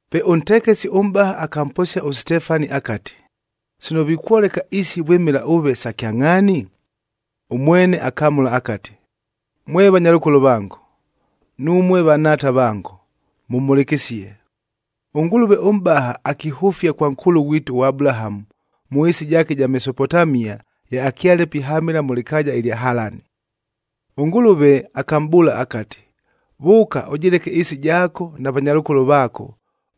Pe ʉntekesi ʉmʼbaha akamposia ʉSitefani akati, “Sino vikwoleka isi vwɨmɨla ʉve sa kyangʼhaani?” Ʉmwene akamʉla akati, “Mwe vanyalʉkolo vango, numue vanhaata vango, mʉmhʉlɨkɨsie! ɄNgʉlʉve ʉMʼbaha akihʉfia kwa nkʉʉlʉ ghwitu ʉAbulahamu mʉ ɨɨsi jaake ɨja Mesopotamia, ye akyale pihamɨla mʉ lɨkaaja ɨlya Halani. ɄNgʉlʉve akamʼbʉʉla akati, ‘Vʉʉka mʉ ɨɨsi jaako ʉvaleke avanyalʉkolo vaako,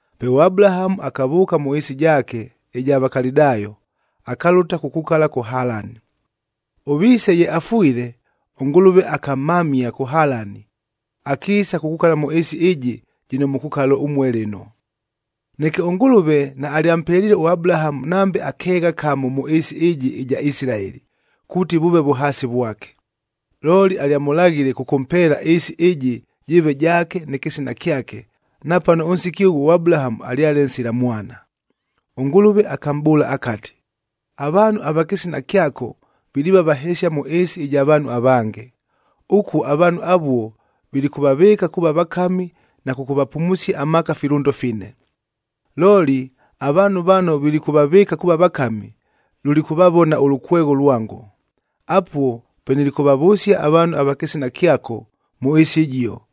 Pe ʉAbulahamu akavʉʉka mʉ ɨɨsi jaake ɨja Vakalidayo,b akalʉta kukukala kʉ Halani. Ʉviise ye afwile, ʉNgʉlʉve akamhamia kʉ Halani, akiisa kukukala mʉ ɨɨsi ɨjɨ jɨno mukukala ʉmue lɨno. “Neke ʉNgʉlʉve naalyampeliile ʉAbulahamu nambe akeegha kamo mʉ ɨɨsi ɨjɨ ɨja Isilaeli, kuuti vʉʉve vʉhaasi vwake. Looli alyamʉlaghile kʉkʉmpeela ɨɨsi ɨjɨ jɨɨve jaake nɨ kɨsina kyake, napano ʉnsiki ʉghuo ʉAbulahamu alyale nsila mwana. ɄNgʉlʉve akamʼbʉʉla akati, ‘Avaanhu ava kɨsina kyako viliiva vahesia mʉ ɨɨsi ɨja vaanhu avange. Ʉkuo avaanhu avuo vilikʉvavɨɨka kuuva vakami na kʉkʉvapumusia amaaka ifilʉndo fine. Looli avaanhu vano vilikʉvavɨɨka kuuva vakami, lulikʉvavona ʉlʉkwegho lwango. Apuo pe nilikʉvavʉsia avaanhu ava kɨsina kyako mʉ ɨɨsi ɨjio,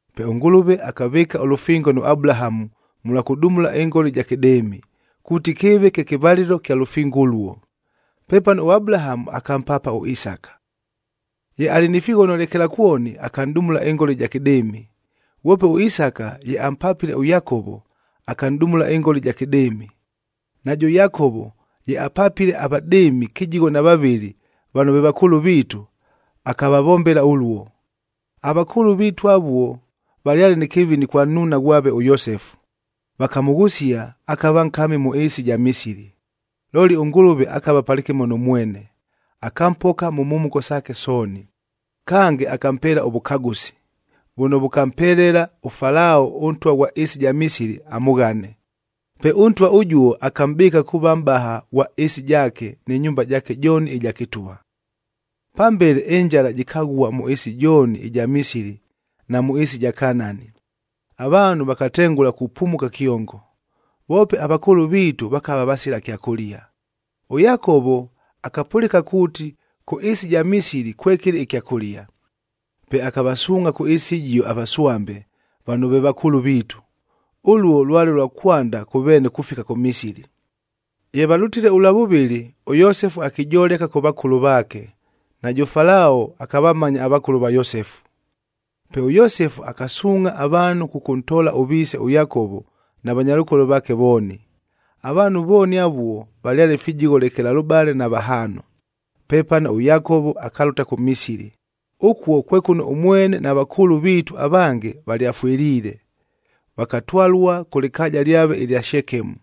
Pe ʉNgʉlʉve akavɨɨka ʉlʉfingo nʉ Abulahamu mʉlwa kʉdumula ɨngola ɨja kɨdɨɨmi,d kuuti kɨɨve kye kɨvalɨlo kya lʉfingo ʉluo. Pepano ʉAbulahamu akampaapa ʉIsaka. Ye alɨ ni fighono lekelakwoni, akanʼdumula ɨngola ɨja kɨdɨɨmi. Ghwope ʉIsaka ye ampapile ʉYakovo, akanʼdumula ɨngola ɨja kɨdɨɨmi. Najʉ Yakovo ye apapile avadɨɨmi kɨjigho na vavɨlɨ vano ve vakʉʉlʉ viitu, akavavombela ʉluo. “Avakʉʉlʉ viitu avuo valyale nɨ kɨvini kwa nnuuna ghwave ʉYosefu, vakamʉghʉsia akava nkami mʉ ɨɨsi ɨja Misili. Looli ʉNgʉlʉve akava palɨkɨmo nʉ mwene. Akampoka mʉ mhumuko saake sooni, kange akampeela ʉvʉkagʉsi, vʉno vʉkampelela ʉFalao ʉntwa ʉghwa ɨɨsi ɨja Misili amʉghane. Pe ʉntwa ʉjuo akamʼbɨɨka kuuva mʼbaha ghwa ɨɨsi jaake nɨ nyumba jaake jooni ɨja kɨtwa. “Pambele ɨnjala jɨkaghua mʉ ɨɨsi jooni ɨja Misili na mʉ ɨɨsi ɨja Kanaani, avaanhu vakatengʉla kupumuka kyongo. Voope avakʉʉlʉ viitu vakava vasila kyakʉlia. ɄYakovo akapʉlɨka kuuti kʉ ɨɨsi ɨja Misili kwekɨlɨ ɨkyakʉlia. Pe akavasuungʼha kʉ ɨɨsi ɨjio avaswambe, vano ve vakʉʉlʉ viitu. Ʉluo lwale lwa kwanda kʉ veene kufika kʉ Misili. Ye valʉtile ʉlwa vʉvɨlɨ, ʉYosefu akijoleka kʉ vakʉlʉ vaake, najʉ Falao akavamanya avakʉlʉ va Yosefu. Pe ʉYosefu akasuungʼha avaanhu kʉkʉntoola ʉviise ʉYakovo na vanyalʉkolo vaake vooni. Avaanhu vooni avuo valyale fijigho lekelalʉbale na vahaano. Pepano ʉYakovo akalʉta kʉ Misili. Ʉkuo kwe kʉno ʉmwene na vakʉʉlʉ viitu avange valyafwɨliile, vakatwalua kʉ lɨkaaja lyave ɨlya Shekemu,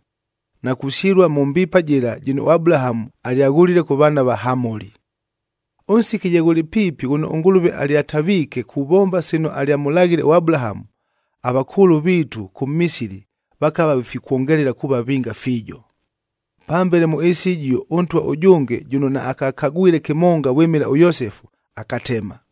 na kusyɨlua mʉ mbiipae jɨla jɨno ʉAbulahamu alyaghʉlile kʉ vaana va Hamoli. “Ʉnsiki ye ghʉlɨ piipi ghʉno ʉNgʉlʉve alyataviike kuvomba sino alyamʉlaghile ʉAbulahamu, avakʉʉlʉ viitu kʉ Misili vakava vifikwongelela kuuva vinga fiijo. Pambele mʉ ɨɨsi ɨjio ʉntwa ʉjʉnge jʉno naakakagwile kɨmonga vwɨmɨla ʉYosefu, akatema.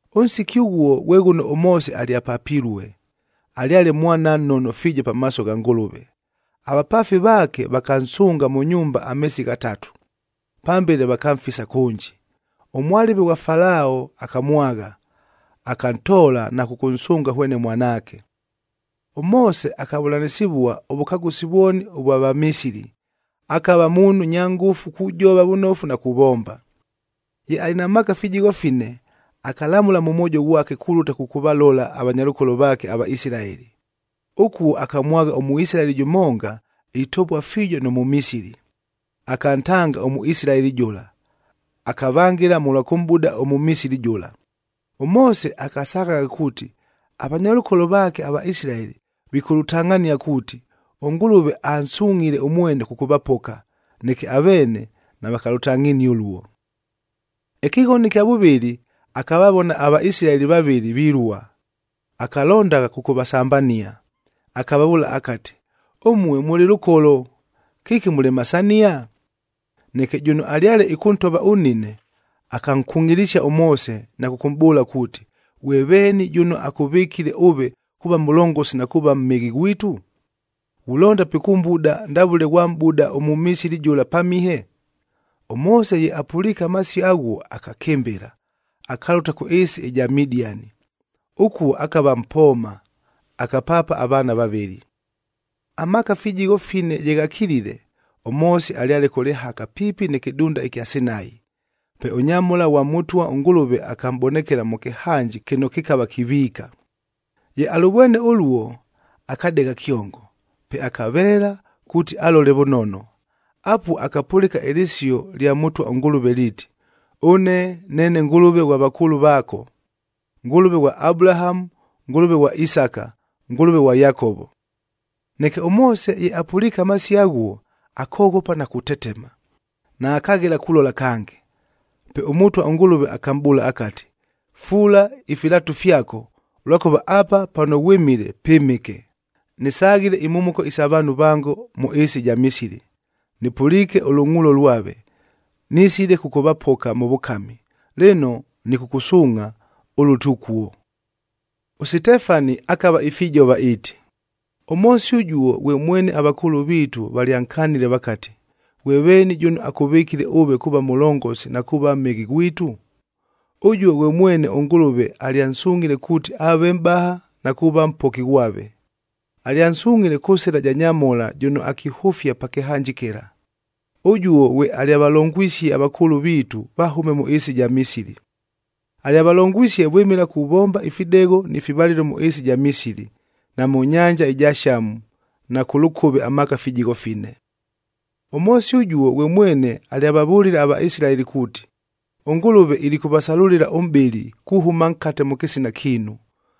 “Ʉnsiki ʉghuo ghwe ghʉno ʉMoose alyapapilue, alyale mwana nnono fiijo pamaaso gha Ngʉlʉve. Avapaafi vaake vakansʉnga mʉ nyumba ameesi ghatatu. Pambele vakamfisa kʉnji. Ʉmwalɨve ghwa Falao akamwagha, akantoola na kʉkʉnsʉnga hwene mwanaake. ɄMoose akavʉlanɨsɨvua ʉvʉkagʉsi vwoni ʉvwa Vamisili, akava muunhu nya ngʉfu kujova vʉnofu na kuvomba. “Ye alɨ na maaka fijigho fine, akalamʉla mʉ mwojo ghwake kulʉta kʉkʉvalola avanyalʉkolo vaake aVaisilaeli. Ʉkuo akamwagha ʉMʉisilaeli jʉmonga itovua fiijo nʉ Mʉmisili, akantanga ʉMʉisilaeli jʉla, akavangɨla mʉlwa kʉmʼbuda ʉMʉmisili jʉla. ɄMoose akasaghagha kuuti avanyalʉkolo vaake aVaisilaeli vikʉlʉtangʼhania kuuti, ʉNgʉlʉve ansungʼhile ʉmwene kʉkʉvapoka, neke aveene navakalʉtangʼhinie ʉluo. “Ɨkɨghono ɨkya vʉvɨlɨ, akavavona aVaisilaeli vavɨlɨ vilua, akalondagha kʉkʉvasambania, akavavʉʉla akati, ‘Ʉmue mʉlɨ lʉkolo, kɨki mulemasania?’ Neke jʉno alyale ɨkʉntova ʉnnine, akankungʼilisia ʉMoose na kʉkʉmʼbʉʉla kuuti, ‘Ghwe veeni jʉno akʉvɨkile ʉve kuuva mʉlongosi na kuuva mhɨghi ghwitu? Ghulonda pikʉmbuda ndavʉle ghwamʼbuda ʉMʉmisili jʉla pamihe?’g ɄMoose ye apʉliike amasio aghuo akakɨmbɨla, akalʉta kʉ ɨɨsi ɨja Midiani. Ʉkuo akava mpooma, akapaapa avaana vavɨlɨ. “Amaaka fijigho fine ye ghakilile, ʉMoose alyale kʉ lɨhaka piipi nɨ kɨdunda ɨkya Sinai. Pe ʉnyamhola ghwa Mʉtwa ʉNgʉlʉve akamʼbonekela mʉ kɨhanji, kɨno kɨkava kiviika. Ye alʉvwene ʉluo, akadegha kyongo, pe akaveela kuuti alole vʉnono. Apuo akapʉlɨka ɨlɨsio lya Mʉtwa ʉNgʉlʉve liiti, ‘Ʉne neene Ngʉlʉve ghwa vakʉʉlʉ vaako: Ngʉlʉve ghwa Abulahamu, Ngʉlʉve ghwa Isaka, Ngʉlʉve ghwa Yakovo.’h Neke ʉMoose ye apʉliike amasio aghuo, akoghopa na kutetema, naakaghela kulola kange. Pe ʉMʉtwa ʉNgʉlʉve akamʼbʉʉla akati, ‘Fuula ifilatu fyako, ʉlwakʉva apa pano ghwɨmile pɨmɨke. Nɨsaghile imhumuko isa vaanhu vango mʉ ɨɨsi ɨja Misili, nɨpʉliike ʉlʉngʼuulo lwave, nisile kʉkʉvapoka mʉ vʉkami. Lɨno, nɨkʉkʉsuungʼha ʉlʉte ʉkuo.’i” ɄSitefani akava ifijova iiti, “ɄMoose ʉjuo ghwe mwene avakʉʉlʉ viitu valyankanile vakati, ‘Ghwe veeni jʉno akʉvɨkile ʉve kuuva mʉlongosi na kuuva mhɨghi ghwitu?’j Ʉjuo ghwe mwene ʉNgʉlʉve alyansungʼhile kuuti aave mʼbaha na kuuva mpoki ghwave. Alyansungʼhile kʉ sɨla ja nyamhola jʉno akihʉfia pa kɨhanji kɨla. Ʉjuo ghwe alyavalongwisie avakʉʉlʉ viitu vahʉme mʉ ɨɨsi ɨja Misili. Alyavalongwisie vwɨmɨla kuvomba ifidegho ni fivalɨlo mʉ ɨɨsi ɨja Misili, na mʉ nyanja ɨja Shamu, na kʉ lʉkʉve amaaka fijigho fine. “ɄMoose ʉjuo ghwe mwene alyavavʉlile aVaisilaeli kuuti, ‘ɄNgʉlʉve ilikʉvasalʉlɨla ʉmʼbɨli, kuhʉma nkate mʉ kɨsina kiinu,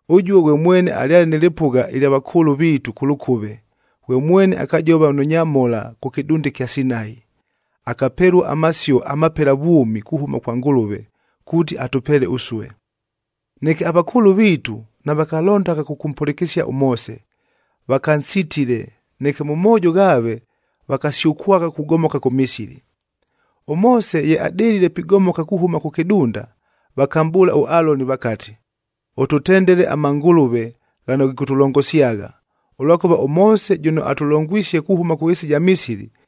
Ʉjuo ghwe mwene alyale nɨ lɨpʉgha ɨlya vakʉʉlʉ viitu kʉ lʉkʉve, ghwe mwene akajova nʉ nyamhola kʉ kɨdunda ɨkya Sinai, akapelua amasio amapela vwʉmi kuhʉma kwa Ngʉlʉve, kuuti atʉpeele ʉsue. “Neke avakʉʉlʉ viitu, navakalondagha kʉkʉmpʉlɨkɨsia ʉMoose, vakansitile, neke mʉ moojo ghaave vakasyʉkwagha kugomoka kʉ Misili. ɄMoose ye adɨlile pigomoka kuhʉma kʉ kɨdunda, vakamʼbʉʉla ʉAloni vakati, ‘Ʉtʉtendele amangʉlʉve ghano ghikʉtʉlongosyagha, ʉlwakʉva ʉMoose jʉno atʉlongwisie kuhʉma kʉ ɨɨsi ɨja Misili,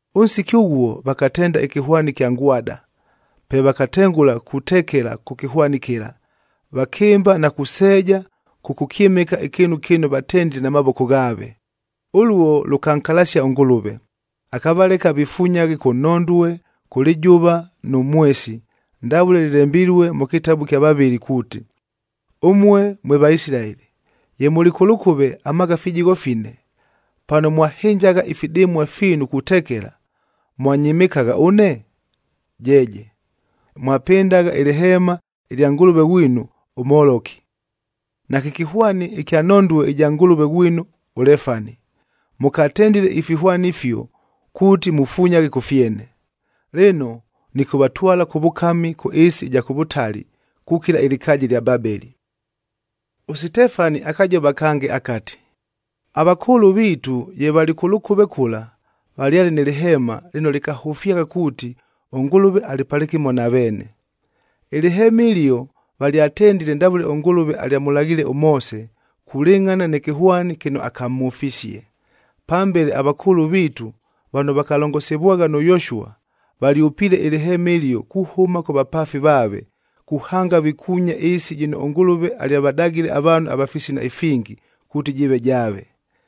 Ʉnsiki ʉghuo vakatenda ɨkɨhwani ɨkya ngwada. Pe vakatengʉla kutekela kʉ kɨhwani kɨla, vakɨmba na kuseeja kʉkʉkyɨmɨka ɨkɨɨnu kɨno vatendile na mavoko ghaave! Ʉluo lʉkankalasia ʉNgʉlʉve, akavaleka vifunyaghe kʉ nhondue, kʉ lɨjʉva nʉ mwesi ndavʉle lɨlembilue mʉ kɨtabu ɨkya vavɨli kuuti, ‘Ʉmue mwe Vaisilaeli, ye mʉlɨ kʉ lʉkʉve amaaka fijigho fine, pano mwahɨnjagha ifidɨmua fiinu kutekela, mwanyɨmɨkagha ʉne? Jeeje! Mwapɨndagha ɨlɨheema ɨlya ngʉlʉve ghwinu ʉMoloki, nakɨ kɨhwani ɨkya nhondue ɨja ngʉlʉve ghwinu ʉLefani. Mʉkatendile ifihwani ifio, kuuti mufunyaghe kʉ fyene. Lɨno, nɨkʉvatwala kʉ vʉkami kʉ ɨɨsi ɨja kʉ vʉtali kukila ɨlɨkaaja ɨlya Babeli.’m” ɄSitefani akajova kange akati, “Avakʉʉlʉ viitu ye valɨ kʉ lʉkʉve kʉla, valyale nɨ lɨheeman lɨno lɨkahʉfyagha kuuti ʉNgʉlʉve alɨ palɨkɨmo na veene. Ɨlɨheema ɨlio valyatendile ndavʉle ʉNgʉlʉve alyamʉlaghiile ʉMoose, kulɨngʼhana nɨ kɨhwani kɨno akamhʉfisie. Pambele avakʉʉlʉ viitu vano vakalongosivwagha nʉ Yoshua, valyʉpiile ɨlɨheema ɨlio kuhʉma kʉ vapaafi vaave, kuhanga vikuunya ɨɨsi jɨno ʉNgʉlʉve alyavadagile avaanhu ava fisina ifingi, kuuti jɨɨve jaave.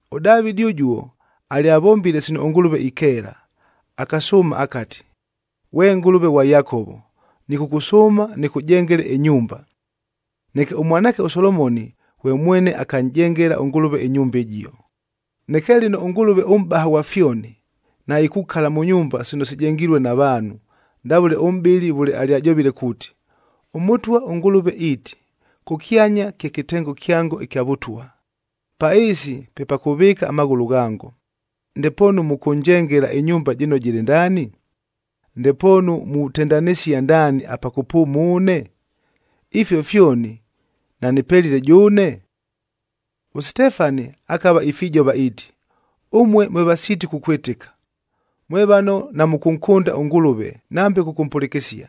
ɄDavɨdi ʉjuo alyavombile sino ʉNgʉlʉve ikeela, akasʉʉma akati, ‘Ghwe Ngʉlʉve ghwa Yakovo, nɨkʉkʉsʉʉma nɨkʉjengele ɨnyumba.’ Neke ʉmwanaake ʉSolomoni ghwe mwene akanʼjengela ʉNgʉlʉve ɨnyumba ɨjio. “Neke lɨno ʉNgʉlʉve ʉMʼbaha ghwa fyoni, naikukala mʉ nyumba sino sijengilue na vaanhu, ndavʉle ʉmʼbɨli vʉle alyajovile kuuti, ‘ɄMʉtwa ʉNgʉlʉve iiti, “Kʉkyanya kye kɨtengo kyango ɨkya Vʉtwa, pa ɨɨsi pe pa kʉvɨɨka amaghʉlʉ ghango. Ndepoonu mʉkʉnjengela ɨnyumba jɨno jɨlɨ ndaani? Ndepoonu mutendanɨsia ndaani apa kʉpʉʉma ʉne? Ifio fyoni nanɨpelile jʉʉne?” ’p” ɄSitefani akava ifijova iiti, “Ʉmue mwe vasiiti kukwɨtɨka! Mwe vano namʉkʉnkʉnda ʉNgʉlʉve nambe kʉkʉmpʉlɨkɨsia.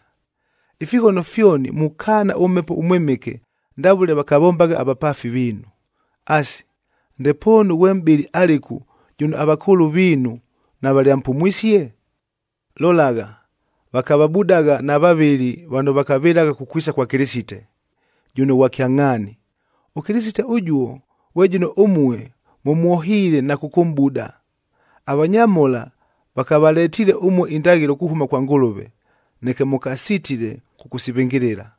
Ifighono fyoni mukaana ʉMhepo ʉMwɨmɨke ndavʉle vakavombagha avapaafi viinu. Asi, ndepoonu ghwe mʼbɨli alɨku jʉno avakʉʉlʉ viinu navalyampumwisie? Lolagha, vakavabudagha na vavɨli vano vakavɨlagha kukwisa kwa Kɨlɨsite, jʉno Ghwa Kyangʼhaani. ɄKɨlɨsite ʉjuo, ghwe jʉno ʉmue mʉmwohiile na kʉkʉmʼbuda. Avanyamhola vakavaletiile ʉmue indaghɨlo kuhʉma kwa Ngʉlʉve, neke mʉkasitile kʉkʉsivɨngɨlɨla.”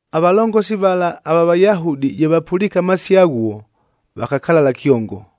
Avalongosi vala ava Vayahudi ye vapʉliike amasio aghuo, vakakalala kyongo,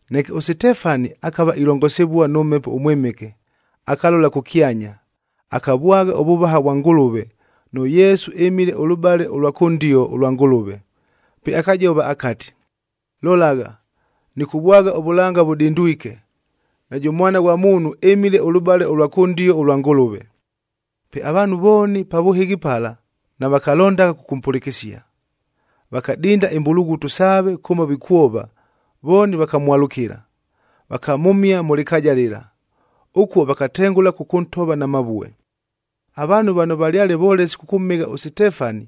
Neke ʉSitefani akava ilongosivua nʉ Mhepo ʉMwɨmɨke, akalola kʉkyanya, akavwagha ʉvʉvaha vwa Ngʉlʉve, nʉ Yesu ɨmile ʉlʉbale ʉlwa kʉndio ʉlwa Ngʉlʉve. Pe akajova akati, “Lolagha, nɨkʉvwagha ʉvʉlanga vʉdindwike, najʉ Mwana ghwa Muunhur ɨmile ʉlʉbale ʉlwa kʉndio ʉlwa Ngʉlʉve.” Pe avaanhu vooni pa vʉhɨghi pala navakalondagha kʉkʉmpʉlɨkɨsia, vakadinda imbulughutu saave kʉmo vikwova, vooni vakamwalʉkɨla. Vakamhʉmia mʉ lɨkaaja lɨla. Ʉkuo vakatengʉla kʉkʉntova na mavue. Avaanhu vano valyale volesi kʉkʉmhɨgha ʉSitefani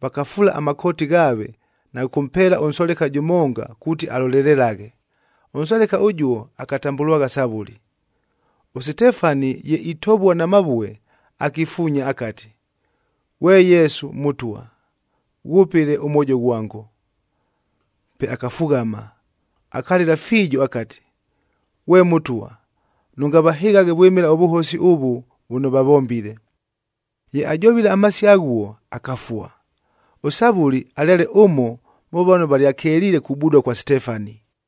vakafuula amakooti ghaaves na kʉkʉmpeela ʉnsoleka jʉmonga kuuti alolelelaghe. Ʉnsoleka ʉjuo akatambʉlwagha Savʉli. ɄSitefani ye itovua na mavue, akifuunya akati, “Ghwe Yesu Mʉtwa, ghwʉpɨle ʉmwojo ghwango.” Pe akafughama, akalɨla fiijo akati, “Ghwe Mʉtwa, nʉngavahɨghaghe vwɨmɨla ʉvʉhosi ʉvʉ vʉno vavombile.” Ye ajovile amasio aghuo, akafua. ɄSavʉli alyale ʉmo mʉ vano valyakeliile kubudua kwa Sitefani.